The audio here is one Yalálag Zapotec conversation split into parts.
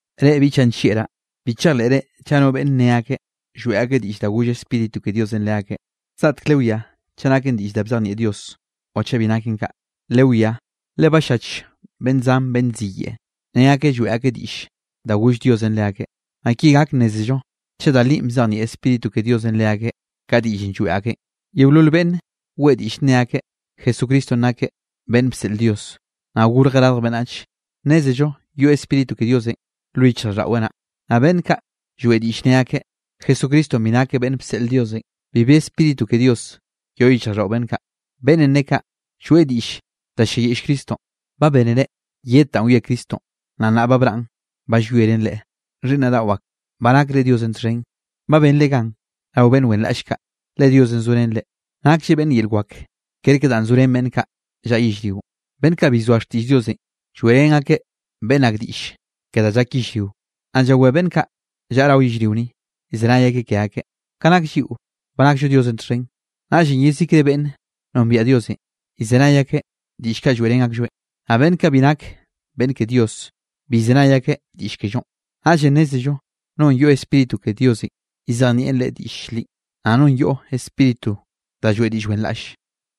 Reꞌ biꞌchaꞌ nllieꞌraꞌ, bi chejleꞌre chaꞌ no beꞌnne nne akeꞌ lloeꞌ akeꞌ diꞌll da goll Spíritu ke Dios leakeꞌ. Zgaꞌtek lewiá chaꞌ naken diꞌll da bzejnieꞌ Dios o chaꞌ bi naken kaꞌ. Lewiá, le ba ll-llach beꞌnn zan beꞌnn ziyeꞌe ne akeꞌ lloeꞌ akeꞌ diꞌll da goll Diosenꞌ leakeꞌ. Naꞌ ki gak nnézello chaꞌ da linꞌ bzejnieꞌ Spíritu ke Diosenꞌ leakeꞌ ka diꞌllenꞌ lloeꞌ akeꞌn: yeolol beꞌnne weꞌe diꞌll ne akeꞌ Jesucristonꞌ nakeꞌ beꞌnn bseꞌl Dios, naꞌ gorjeꞌ radj beꞌnnach, nnézello yoꞌ Spíritu ke Diosenꞌ lo yichjraꞌlldaꞌweꞌ naꞌ. Naꞌ beꞌnn kaꞌ lloeꞌ diꞌll ne akeꞌ Jesucristonꞌ bi nakeꞌ beꞌnn bseꞌl Diosenꞌ, bibi Spíritu ke Dios yoꞌ yichjraꞌlldaꞌo beꞌnn kaꞌ. Beꞌnnenꞌ ne kaꞌ lloeꞌ diꞌll da ll-lliayiꞌll Cristonꞌ. Ba bénere yed da wie Cristonꞌ. Naꞌ nnaꞌ ba braꞌn ba llwieren Leꞌe. Xhiꞌnnaꞌ daꞌo ak, ba nakre Diosenꞌ txhen, ba benre gan rao beꞌnn wenraꞌll kaꞌ, le Diosenꞌ zorén reꞌ, naklleꞌ beꞌnn yel wak kerke danꞌ zo ren beꞌnn kaꞌ llaꞌa yellrionꞌ. Beꞌnn kaꞌ bi llzoa xtiꞌll Diosenꞌ lloeꞌrén akeꞌ beꞌnn ak diꞌll ke da llak yellrio, naꞌ llawé beꞌnn kaꞌ llaꞌa rao yellrio ni, llzenay akeꞌ ke akeꞌ. Ka nak lliꞌo, ba nakllo Diosenꞌ txhen, naꞌllenꞌ yezikre beꞌnn nombiaꞌ Diosenꞌ, llzenay akeꞌ diꞌll kaꞌ lloeꞌrén aklloeꞌn, naꞌ beꞌnn kaꞌ bi nak beꞌnn ke Dios, bi llzenay akeꞌ diꞌll kellonꞌ. Naꞌllenꞌ nnézello nonꞌ yoꞌ Spíritu ke Diosenꞌ llzejnieꞌn leꞌe diꞌll li, naꞌ nonꞌ yoꞌ spíritu da lloeꞌ diꞌll wenraꞌll.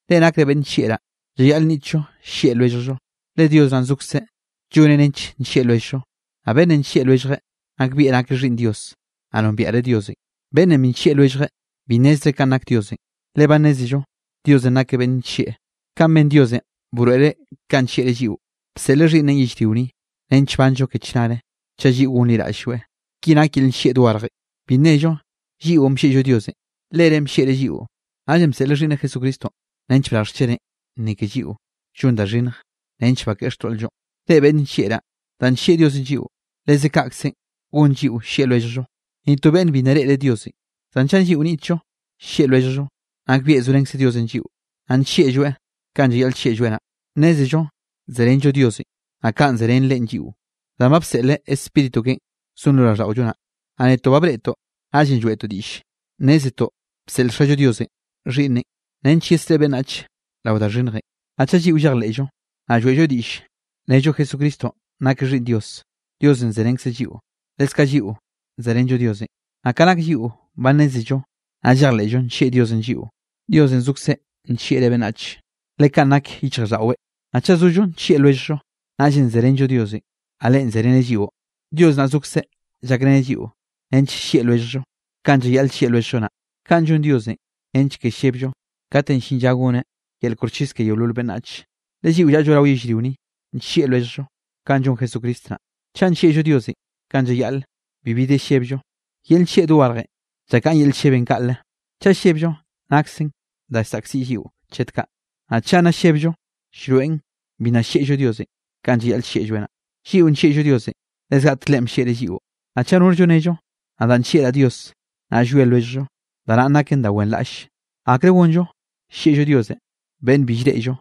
Reꞌ nakre beꞌnn nllieꞌraꞌ, llayaꞌl nniꞌtllo llieꞌ lwelljllo, le Dios naꞌn zokze lloneꞌ nench nllieꞌ lwelljllo. Naꞌ beꞌnnenꞌ nllieꞌ lwelljeꞌ nakbieꞌ nakeꞌ xhiꞌnn Dios, naꞌ nombieꞌreꞌ Diosenꞌ. Beꞌnnenꞌ bi nllieꞌ lwelljeꞌ bi nnezreꞌ kanꞌ nak Diosenꞌ, le ba nnézello Diosenꞌ nakeꞌ beꞌnn nllieꞌ. Kaꞌn ben Diosenꞌ broeꞌreꞌ kanꞌ nllieꞌreꞌ lliꞌo, bseꞌleꞌ Xhiꞌnneꞌn yellrio ni nench banllo ke chnare, chaꞌ lliꞌo gonliraꞌll-lloeꞌ. Ki nak yel nllieꞌ dogarje: Bi nnello lliꞌon bllieꞌllo Diosenꞌ, Lereꞌn bllieꞌreꞌ lliꞌo, naꞌllenꞌ bseꞌleꞌ Xhiꞌnneꞌ Jesucristonꞌ nench brarjeꞌ xcheneꞌ ni ke lliꞌo llon da xhinnj nench bakeꞌe xtoꞌl-llonꞌ. Reꞌ beꞌnn nllieꞌraꞌ, danꞌ nllieꞌ Diosenꞌ lliꞌo, leze kaꞌkzenꞌ gon lliꞌo llieꞌ lwelljllo. Ni to beꞌnne bi nna reꞌreꞌ Diosenꞌ. Zan chaꞌ lliꞌo nniꞌtllo llieꞌ lwelljllo, nakbieꞌ zorenkze Diosenꞌ lliꞌo, naꞌ nllieꞌlloeꞌ kanꞌ llayaꞌl llieꞌlloeꞌ naꞌ. Nnézello zerenllo Diosenꞌ, naꞌ kaꞌ zerén Leꞌen lliꞌo, danꞌ ba bseꞌleꞌ Spíritu keꞌen zon lo raꞌlldaꞌollo naꞌ. Naꞌ netoꞌ ba breꞌtoꞌ, naꞌllenꞌ lloeꞌtoꞌ diꞌll nnézetoꞌ bseꞌl Xallo Diosenꞌ Xhiꞌnneꞌn nench yesreꞌe beꞌnnach rao da xhinnjenꞌ. Naꞌ chaꞌ lliꞌo llejleꞌllo, naꞌ lloeꞌllo diꞌll nello Jesucristonꞌ nakeꞌ Xhiꞌnn Dios, Diosenꞌ zerenkzeꞌ lliꞌo, leskaꞌ lliꞌo zerenllo Diosenꞌ. Naꞌ ka nak lliꞌo ba nnézello, naꞌ llejleꞌllo nllieꞌ Diosenꞌ lliꞌo. Diosenꞌ zokzeꞌ nllieꞌreꞌ beꞌnnach, le kaꞌn nak yichjraꞌlldaꞌweꞌ. Naꞌ chaꞌ zollo nllieꞌ lwelljllo, naꞌllenꞌ zerenllo Diosenꞌ, naꞌ Leꞌe zereneꞌ lliꞌo. Dios naꞌ zokzeꞌ llakreneꞌ lliꞌo nench llieꞌ lwelljllo kanꞌ llayaꞌl llieꞌ lwelljllo naꞌ, kaꞌn llon Diosenꞌ nench ke lleblloeꞌ kate llin lla goneꞌ yel koxchis ke yeolol beꞌnnach. Le lliꞌo llaꞌllo rao yellrio ni, nllieꞌ lwelljllo kanꞌ llon Jesucristo naꞌ. Chaꞌ nllieꞌllo Diosenꞌ kanꞌ llayaꞌle, bibi de llebllo. Yel nllieꞌ dogarje llakaꞌn yel llebenꞌ kaꞌle. Chaꞌ llebllo, naksen da llsaꞌkziꞌ lliꞌo chet kaꞌ, naꞌ chaꞌ nna llebllo, llroeꞌn bi nna llieꞌllo Diosenꞌ kanꞌ llayaꞌl llieꞌlloeꞌ naꞌ. Lliꞌo nllieꞌllo Diosenꞌ, le zgaꞌtek Leꞌen bllieꞌreꞌ lliꞌo. Naꞌ chaꞌ norllo nello: “Nadaꞌ nllieꞌraꞌ Dios”, naꞌ llwie lwelljllo, da naꞌn naken da wenraꞌlle. ¿Akre gonllo llieꞌllo Diosenꞌ beꞌnn bi llreꞌllo,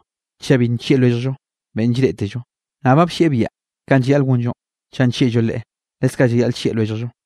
chaꞌ bi nllieꞌ lwelljllo beꞌnn llreꞌtello? Naꞌ ba bllieꞌ biaꞌa kanꞌ llayaꞌl gonllonꞌ: chaꞌ nllieꞌllo Leꞌe, leskaꞌ llayaꞌl llieꞌ lwelljllo.